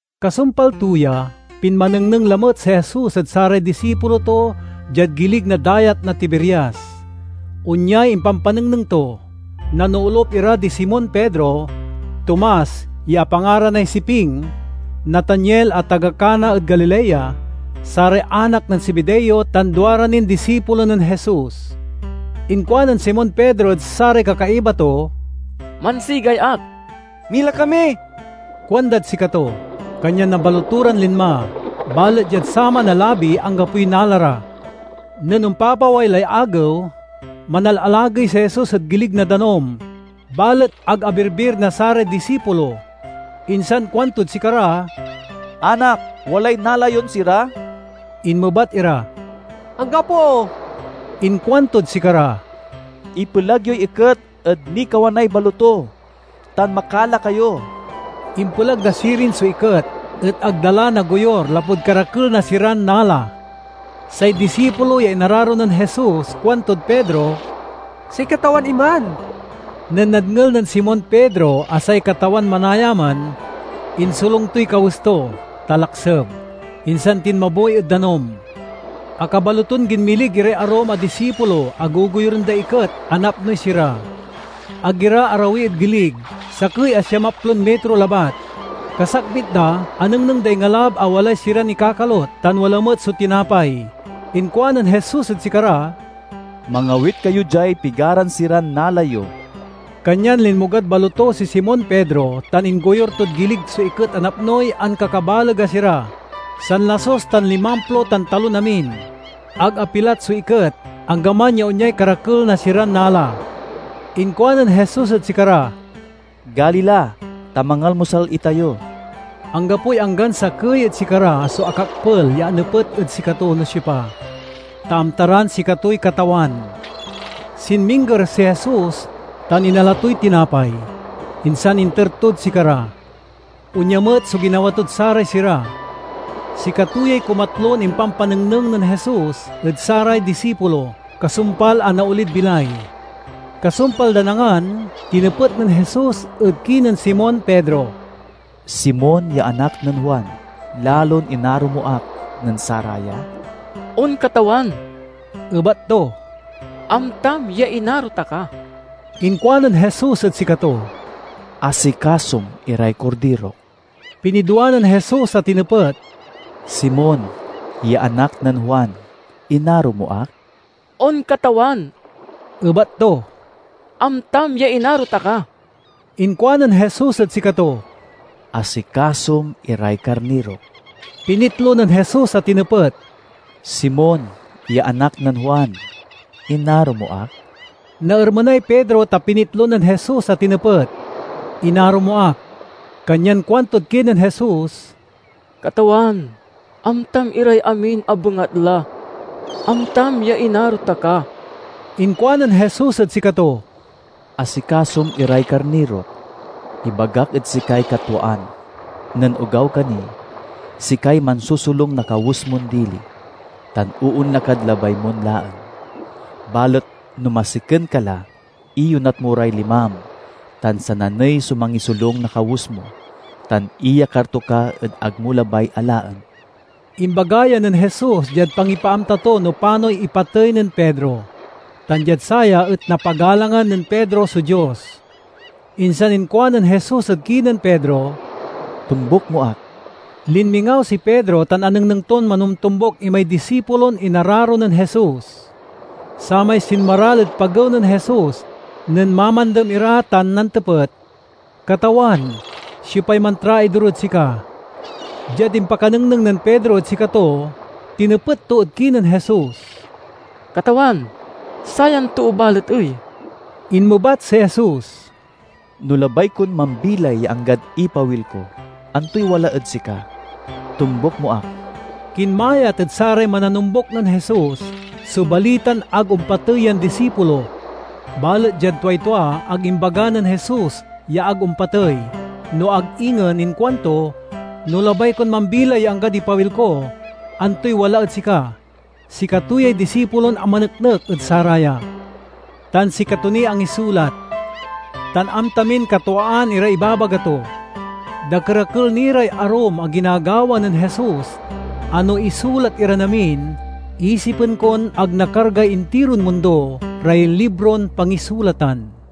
Kasumpal to ya, pinmanengneng lamet si Jesus ed saray disipulo to diad gilig na Dayat na Tiberias. Onyay impampanengneng to. Nanoolup ira di Simon Pedro, Tomas (ya apangaranay Siping), Nataniel (a taga Cana ed Galilea), saray anak nen Zebedeo tan duara nin disipulo nen Jesus. Inkuanen Simon Pedro ed saray kakaiba to, "Mansigay ak." "Mila kami," kuandad sikato. Kanyan nambaloto ran linma. Balet diad saman a labi anggapoy nala ra. Nen ompapaway lay agew, manalalagey si Jesus ed gilig na danum, balet ag abirbir na saray disipulo. Insan kuantod sikara, "Anak, walay nala yon sira?" Inmebat ira, "Anggapo." Inkuantod sikara, "Ipelag yoy iket ed nikawanay baloto tan makala kayo." Impelag da sirin so iket, et ag da la nagoyur lapud karakel na siran nala. Say disipulo ya inararo nen Jesus kuantod Pedro, "Say Katawan iman!" Nen nadngel nen Simon Pedro a say Katawan manaya man, insolung toy kawes to (ta lakseb) insan tinmabuy ed danum. Akabaloton ginmilig iray arum a disipulo a gogoyuren day iket a napnoy sira. Ag ira arawi ed gilig, sakey a siamaplon mitro labat. Kasakbit da, anengneng day ngalab a walay siran ikakalut, tan wala met so tinapay. Inkuanen Jesus ed sikara, "Mangawit kayo diay pigaran siran nala yo." Kanyan linmogad baloto si Simon Pedro tan inggoyur tod gilig so iket a napnoy ankakabaleg a sira—sanlasus tan limamplo tan talon amin. Ag apilat so iket, anggaman ya onyay karakel na siran nala. Inkuanen Jesus ed sikara, "Gali la, ta mangalmusal itayo." Anggapoy anggan sakey ed sikara so akakpel ya anepet ed sikato no siopa, ta amta ran sikatoy Katawan. Sinmingger si Jesus tan inala toy tinapay, insan inter tod sikara. Onya met so ginawa tod saray sira. Sikato yay kumatlon impanpanengneng nen Jesus ed saray disipulo, kasumpal a naolid bilay. Kasumpal dan angan, tinepet nen Jesus ed kinen Simon Pedro, "Simon ya anak nen Juan, lalon inaro mo ak nen saraya?" "On, Katawan," ebat to, "amta ya inaro ta ka." Inkuanen Jesus ed sikato, "Asikasom iray kordirok." Pinidwa nen Jesus a tinepet, "Simon ya anak nen Juan, inaro mo ak?" "On, Katawan," ebat to, "amtam ya inaro ta ka." Inkuanen Jesus ed sikato, "Asikasom iray karnirok." Pinitlo nen Jesus a tinepet, "Simon ya anak nen Juan, inaro mo ak?" Naermenay Pedro ta pinitlo nen Jesus a tinepet, "Inaro mo ak?" Kanyan kuantod kinen Jesus, "Katawan, amtam iray amin a bengatla; amtam ya inaro ta ka!" Inkuanen Jesus ed sikato, "Asikasom iray karnirok. Ibagak ed sikay katwaan: nen ogaw ka ni, sikay mansosolung na kawes mon dili tan oonla kad labay mon laen. Balet no masiken ka la, iyonat mo ray limam tan sananey so mangisolung na kawes mo tan iyakar to ka ed ag mo labay a laen." (Imbaga ya nen Jesus diad pangipaamta to no panoy ipatey nen Pedro, tan diad saya et napagalangan nen Pedro so Dios.) Insan inkuanen Jesus ed kinen Pedro, "Tombuk mo ak!" Linmingaw si Pedro tan anengneng ton manomtombuk imay disipulon inararo nen Jesus—samay sinmaral ed pagew nen Jesus nen mamandem ira tan nantepet, "Katawan, siopay mantraidor ed sika?" Diad impakanengneng nen Pedro ed sikato tinepet to ed kinen Jesus, "Katawan, sayan too balet ey?" Inmebat si Jesus, "No labay kon mambilay ya anggad ipawil ko, antoy wala ed sika? Tombuk mo ak!" Kinmayat ed saray mananombuk nen Jesus so balitan ag ompatey yan disipulo. Balet diad tuay tua ag imbaga nen Jesus ya ag ompatey, no ag ingen inkuanto, "No labay kon mambilay ya anggad ipawil ko, antoy wala ed sika?" Sikato yay disipulon amaneknek ed saraya, tan sikato niy angisulat. Tan amta min katwaan iray imbabaga to. Dakerakel ni ray arum a ginagawa nen Jesus a no isulat iran amin, isipen kon ag nakargay intiron mundo ray libron pangisulatan.